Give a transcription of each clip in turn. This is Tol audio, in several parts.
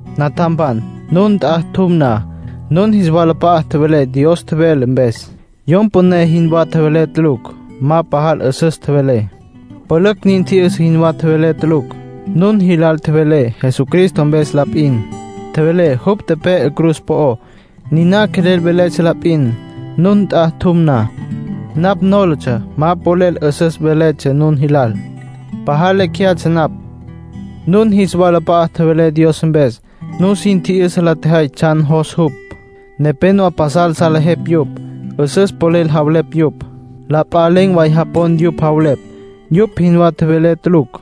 Natjampan, nun nt'a tjum na, nun jis walap'a'a tjevelé Dios tjevele mpes. Yom püné jinwá tjevelé tulucj. Ma pajal 'üsüs tjevelé. Pülücj nin tji'yüsa jinwá tjevelé tulucj. Nun jilal tjevelé Jesucristo mpes la p'in, tjevelé jupj tepe'e cruz po'ó. Niná quelel veletsja la p'in. Nun nt'a tjum na, napj nólatsja ma polel 'üsüs veletsja nun jilal. Pajal lecj jeyatsja napj. Nun jis walap'a'a tjevelé Dios mpes. Nusin tji'yüsa la tjejay tsjan jos jupj. Nepénowa pasal salejepj yupj, 'üsüs polel javelepj yupj. La p'a len̈ way japon yupj javelepj. Yupj jinwá tjevelé tulucj.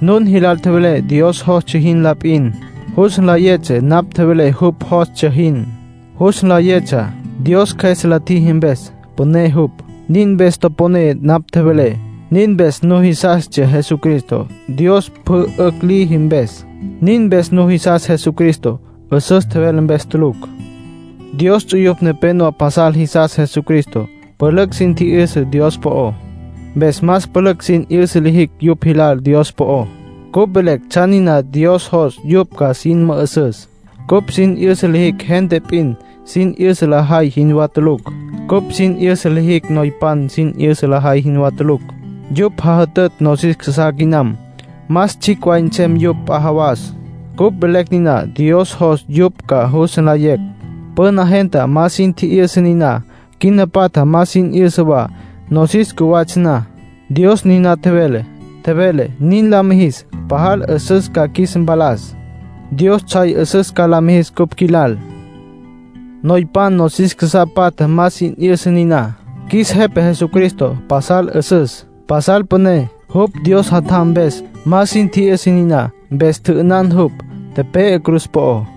Nun jilal tjevelé Dios jostsja jin la p'in. Jus nlayetsja napj tjevelé jupj jostsja jin. Jus nlayetsja, Dios Cjües la tjiji mpes; püné jupj. Nin mpes toponé napj tjevelé, nin mpes nujisastsja Jesucristo, Dios pjü 'ücj liji mpes. Nin mpes nujisas Jesucristo, 'üsüs tjevelé mpes tulucj. Dios ts'uyupj nepenowá pasal jisas Jesucristá, pülücj sin tji'yüsa Dios po'ó. Mpes más pülücj sin 'yüsa lijicj yupj jilal Dios po'ó. Cupj velecj tsjan niná Dios jos yupj ca sin mü'üsüs. Cupj sin 'yüsa lijicj gente p'in sin 'yüsa lajay jinwá tulucj. Cupj sin 'yüsa lijicj noypan sin 'yüsa lajay jinwá tulucj. Yupj jajütütj nosis casá quinam. Más tsjicj way nsem yupj p'a jawas. Cupj velecj niná Dios jos yupj ca jus nlayecj. Püna gente ma sin tji'yüsa niná. Quina patja ma sin 'yüsa wa. Nosis cjuwatsja na, Dios niná tjevele. Tjevele nin la mijis pajal 'üsüs ca qjuis mpalas. Dios tsjay 'üsüs ca la mijis cupj qjuilal. Noypan nosis casá patja ma sin tji'yüsa niná. Qjuis Jepa Jesucristo pasal 'üsüs, pasal püné, jupj Dios Jatjam mpes. Ma sin tji'yüsa niná, mpes tjü'ünan jupj, tepe'e cruz po'ó.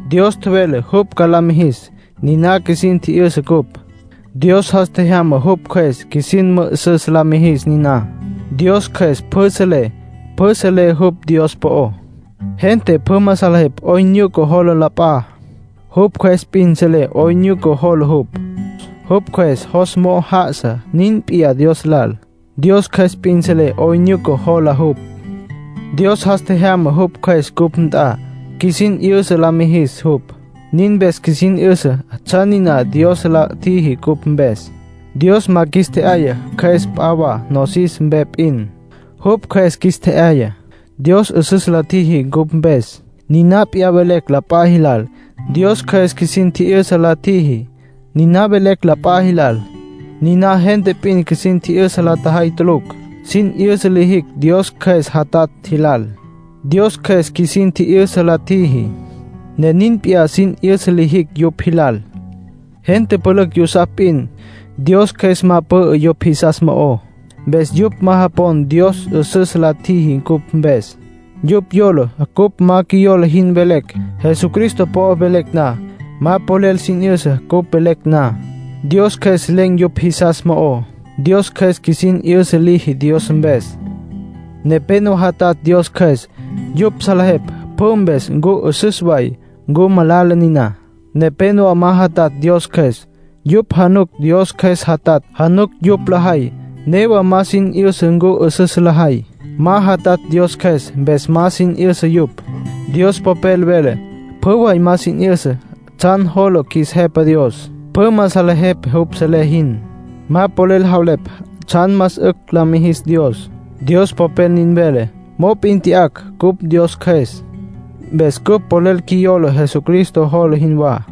Dios tjevele jupj ca la mijis, niná qjuisin tji'yüsa cupj. Dios jas tjejyama jupj Cjües qjuisin mü'üsüs la mijis niná. Dios Cjües pjü selé. Pjü selé jupj Dios po'ó. Gente pjü ma salejepj 'oyn nyuca jola la p'a. Jupj cjües p'in selé 'oyn nyuca jola jupj. Jupj cjües jos mo'o já'asa. Nin p'iyá Dios lal. Dios Cjües p'in selé 'oyn nyuca jola jupj. Dios jas tjejyama jupj Cjües cupj nt'a, qjuisin 'yüsa la mijis jupj; nin mpes qjuisin 'yüsa tsjan niná Dios la tjiji cupj mpes. Dios ma qjuis tje'yaya cjües p'a wa, nosis mpe p'in; jupj Cjües qjuis tje'yaya. Dios 'üsüs la tjiji cupj mpes, niná p'iyá velecj la p'a jilal. Dios Cjües qjuisin tji'yüsa la tjiji, niná velecj la p'a jilal. Niná gente p'in qjuisin tji'yüsa la tjajay tulucj. Sin 'yüsa lijicj Dios Cjües jatatj jilal. Dios Cjües qjuisin tji'yüsa la tjiji, ne nin p'iyá sin 'yüsa lijicj yupj jilal. Gente pülücj yusapj p'in; Dios Cjües ma pü'ü yupj jisas mo'ó. Mpes yupj ma japon Dios 'üsüs la tjiji cupj mpes. Yupj yola cupj ma qjuiyola jin velecj, Jesucristo po'o velecj na. Ma polel sin 'yüsa cupj velecj na; Dios Cjües len̈ yupj jisas mo'ó. Dios Cjües qjuisin 'yüsa liji Dios mpes. Nepénowa jatatj Dios Cjües. Yupj salejepj pjü mpes ncu 'üsüs way, ncu malala niná. Nepénowa ma jatatj Dios Cjües; yupj januc Dios Cjües jatatj, januc yupj lajay. Newa ma sin 'yüsa ncu 'üsüs lajay; ma jatatj Dios Cjües, mpes ma sin 'yüsa yupj. Dios Popel vele: “Pjü way ma sin 'yüsa tsjan jola qjuis Jepa Dios. Pjü ma salejepj jupj selé jin. Ma polel javelepj tsjan más 'ücj la mijis Dios”, Dios Popel nin vele. Mop'in tya'acj cupj Dios Cjües. Mpes cupj polel qjuiyola Jesucristo jola jinwá.